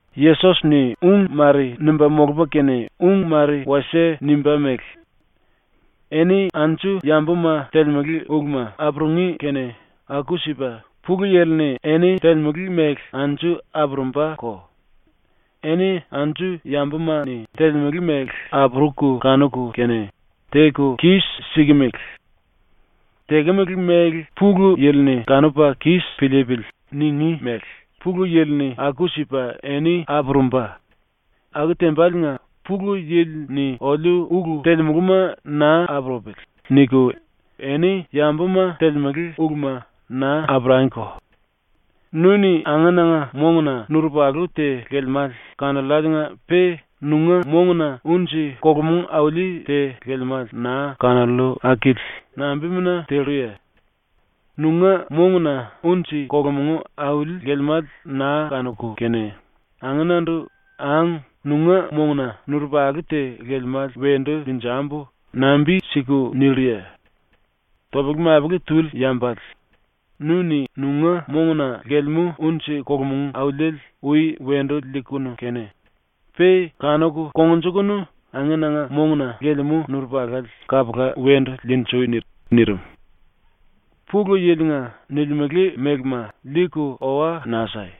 ⸤Yesos-ni ung mare nimba molupa kene ung mare wasie nimba mele:⸥ “Eni anju yambuma ⸤telemele uluma⸥ apurungí kene aku-sipa ⸤Pulu Yili-ni⸥ eni telemele mele anju apurumbako. Eni anju yambuma-ni telemele mele apuruku kanuku kene “Teku kis-sikimili. Tekemele mele Pulu Yili-ni kanupa kis piliipili.” ningí mele ⸤Pulu Yili-ni⸥ aku-sipa eni apurumba. Aku tembaliinga ‘⸤Pulu Yili-ni⸥ oliu ulu telemuluma naa apurupili.’ niku eni yambuma telemele uluma naa apurangiko. “Nu-ni angenanga monguna nurupalu te lelemále kanolláliinga-pe nunga monguna unji-kolomong auli te lelemále naa kanollu akili nambimuna telluye? Nunga monguna unji-kolomong auli lelemále naa kanuku kene angenandu “Ang, nunga monguna nurupalu te lelemále wendu liinjambu.” nambi-siku nilluye? Topele-mapele tuli yambale, nu-ni nunga monguna lelemú unji-kolomong auliele ui wendu liikunu kene pe kanuku kongnjukunu angenanga monguna lelemú nurupalale kapula wendu liinjui.” ⸤nirim.⸥ “‘Pulu Yili-nga’ nilimele mélema liiku owa naa sai.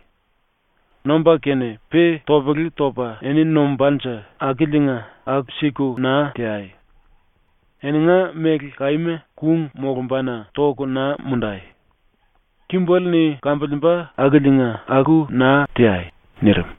Nomba kene pe topele topa eni nombánje akiliinga aku-siku naa teai. Eninga méle kaíma kung molumbana toku naa mundai. Kimbele-ni kambiliimba akiliinga aku naa teai.” ⸤nirim.⸥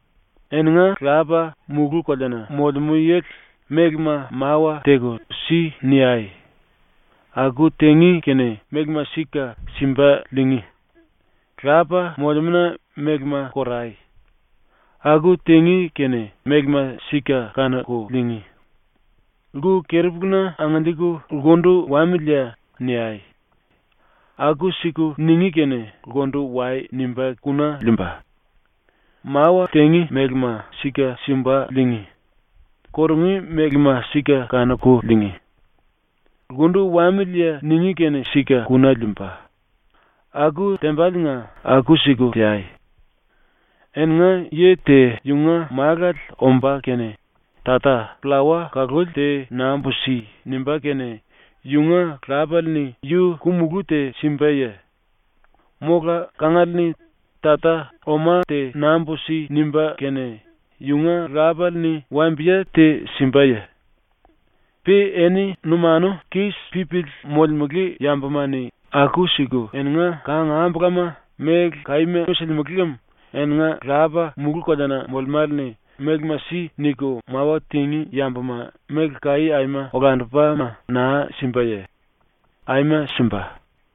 “⸤Eninga Lapa, mulú-koleana molemú yili,⸥ mélema mawa teku “Si.” niai. Aku tingí kene mélema sika simba liingí. ⸤Lapa molemúna⸥ mélema korai. Aku tingí kene mélema sika kanuku liingí. Lku-keri-puluna angiliiku “Lkundu wamiliye?” niai. Aku-siku ningí kene “Lkundu wai.” nimba kuna liimba. Mawa tingí mélema sika simba liingí; kurungí mélema sika kanuku liingí; “Lkundu wamiliye?” ningí kene sika kuna liimba. Aku tembaliinga aku-siku teai. “Eninga yi te yunga málale omba kene “Tata, pllawa kaluli te nambu si.” nimbá kene yunga lapale-ni yu ku-mulú te simbaye? Mola kangale-ni “Tata, oma te nambu si.” nimbá kene yunga lapale-ni wambiye te simbaye? Pe eni numanu kis pípili molemele yambuma-ni aku-siku eninga kangambulama méle kaíma silimele lem eninga Lapa mulú-koleana molemále-ni “Mélema si.” niku mawa tingí yambuma méle kaí aima olandupama naa simbaye? ⸤Aima simba.⸥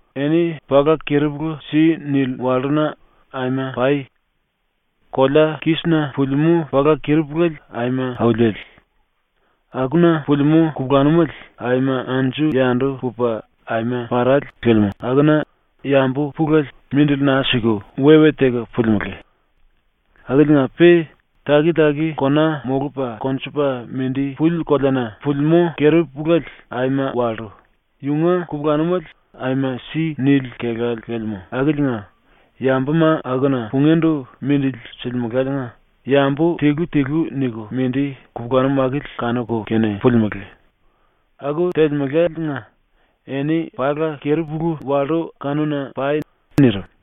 “Eni pala keri-pulu si nili wallúna aima pai. Kolea kísina pulimú pala keri-puléle aima auliele, akuna pulimú kupulanumele aima anju-yandu pupa aima parále lelemú akuna yambu pulele mindili naa siku we-we teku pulimelé. Akiliinga-pe taki-taki kona molupa konjupa mindi puli koleana pulimú keri-puléle aima wallú, yunga kupulanumele aima si nili kelále lelemú akiliinga yambuma akuna pungíndu mindili silimeláliinga yambu tilu-tilu niku mindi kupulanum akili kanuku kene pulimelé. Aku telemeláliinga eni pala keri-pulu wallú kanuna pai.” ⸤nirim.⸥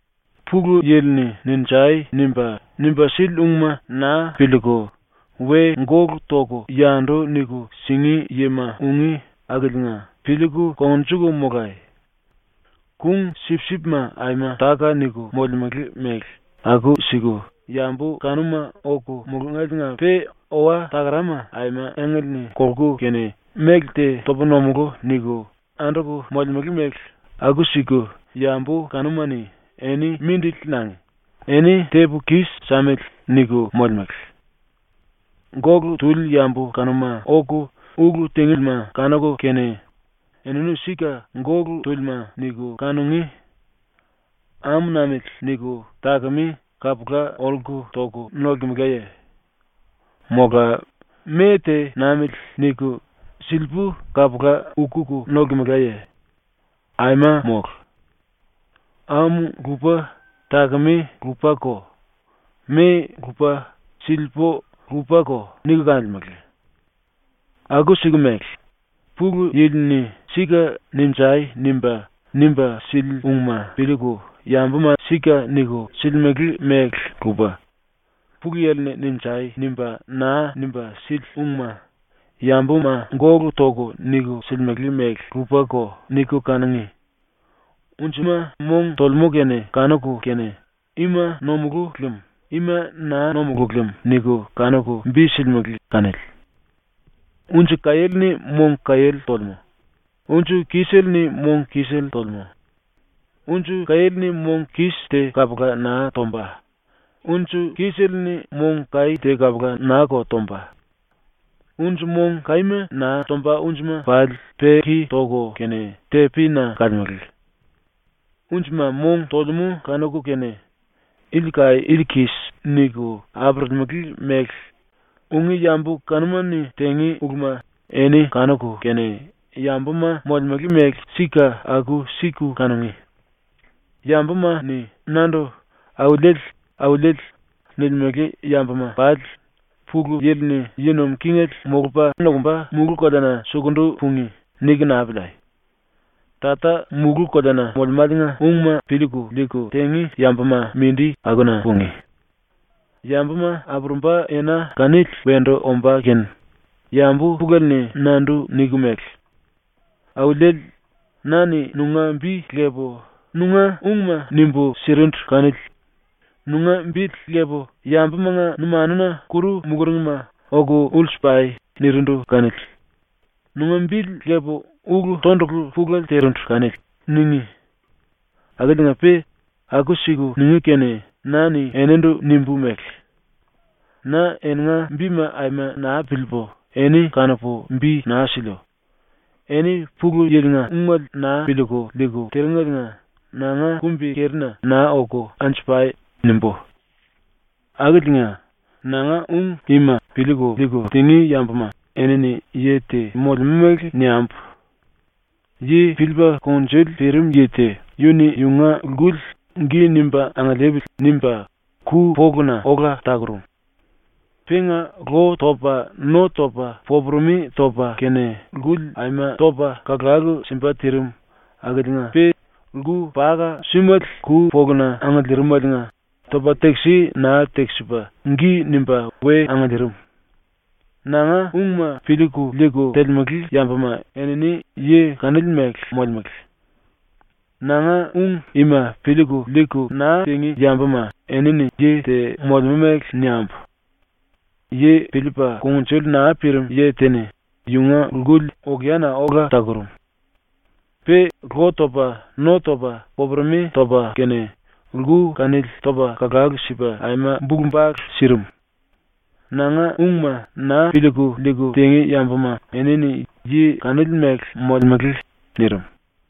“Pulu Yili-ni “Ninjai!” nimba, nimba sili ungma naa piliiku we gólu toku yandu niku singí yima ungí akiliinga piliiku kongnjuku molai. Kung-sipsipma aima táka-niku molemele mele aku-siku yambu kanuma oku mulungéliinga-pe owa-takarama aima engle-ni kolku kene ‘Méle te topu nomulú.’ niku anduku molemele mele aku-siku yambu kanuma-ni ‘Eni mindili nangi. Eni tepu kis-samili.’ niku molemele. Gólu tuli yambu kanuma oku ulu tingíma kanuku kene, ‘Enini sika gólu túlima.’ niku kanungí. ‘Ámu namili.’ niku takemé kapula olku toku nolkemelaye? Mola ‘Me te namili.’ niku silipú kapula ukuku nolkemelaye? Aima mólu. ‘Ámu lupa, takemé lupako; me lupa, silipú lupako.’ niku kanolemele. ⸤Aku-siku mele Pulu Yili-ni sika “Ninjai!” nimba, nimba sili ungma piliiku yambuma sika niku silimele mele lupa, Pulu Yili-ni “Ninjai!” nimba, naa nimba sili ungma yambuma gólu toku niku silimele mele lupako niku kanungí.⸥ Unjima mong tolemú kene kanuku kene ‘Ima nomulú lem. Ima naa nomulú lem.’ niku kanuku bi silimele kanili. Unji kaiéle-ni mong kaiéle tolemú; unji kisele-ni mong kisele tolemú. Unji kaiéle-ni mong kis te kapula naa tomba; unji kisele-ni mong kaí te kapula naa-ko tomba. Unji mong kaíma naa tomba unjima pali peki toku kene tepina kalemele. Unjima mong tolemú kanuku kene, “Ili kaí, ili kis.” niku apurulimele mele, ungí yambu kanuma-ni tingí uluma eni kanuku kene yambuma molemele mele sika aku-siku kanungí. “‘Yambuma-ni nandu ‘Auliele. Auliele.’ nilimele yambuma pali Pulu Yili-ni yi nuim kingele molupa nokumba mulú-koleana sukundu pungí.’ niku naa piliai. Tata mulú-koleana molemáliinga ungma piliiku liiku tingí yambuma mindi akuna pungí. Yambuma apurumba ena kanili wendu ombá kene yambu pulele-ni nandu niku mele: “Auliele, na-ni nunga bi lepu nunga ungma nimbu sirindu kanili; nunga bili lepu yambumanga numanuna kuru muluringma “Oku ulsu pai.” nirindu kanili; nunga bili lepu ulu tondulu pulele tirindu kanili.” ningí. Akiliinga-pe aku-siku ningí kene na-ni enindu nimbu mele: “Na eninga bima aima naa piliipu eni kanupu bi naa siliu. Eni Pulu Yili-nga ungele naa piliiku liiku tiringeliinga nanga kumbi-kerina naa oku anju pai.” nimbú. “Akiliinga, nanga ung ima piliiku liiku tingí yambuma enini yi te molemú mele niambu: Yi piliipa kungnjuli pirim yi te yu-ni yunga lkuli ‘gi nimba angiliipili.’ nimba ku-poluna ola takurum. Penga lo topa no topa popuremi topa kene lkuli aima topa kalalu simba tirim akiliinga-pe lku paka-súmele ku-poluna angiliirimeliinga topa tekisi naa tekisipa gi nimba we angiliirim. Nanga ungma piliiku liiku telemele yambuma enini yi kanili mele molemele. “Nanga ung ima piliiku liiku naa tingí yambuma enini yi te molemú mele niambu: Yi piliipa kungnjuli naa pirim yi te-ni yunga lkuli okeana ola takurum. Pe lo topa no topa popuremi topa kene lku kanili topa kalalu sipa aima bulu-bale sirim. Nanga ungma naa piliiku liiku tingí yambuma enini yi kanili mele molemele.” nirim.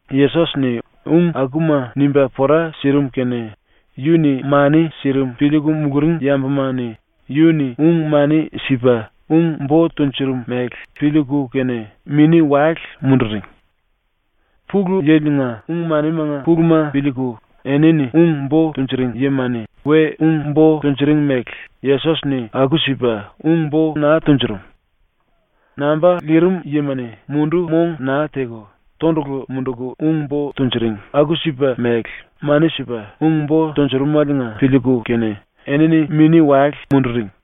Yesos-ni ung akuma nimba pora sirim kene yu-ni mani sirim piliiku muluring yambuma-ni yu-ni ung-mani sipa ung-bo tunjurum mele piliiku kene mini-wale munduring. Pulu Yili-nga ung-manimanga puluma piliiku enini ung-bo tunjuring yima-ni we ung-bo tunjuring mele Yesos-ni aku-sipa ung-bo naa tunjurum. Namba lirim yima-ni mundu-mong naa teku tondulu munduku ung-bo tunjuring aku-sipa mele mani sipa ung-bo tunjurumeliinga piliiku kene enini mini-wale munduring.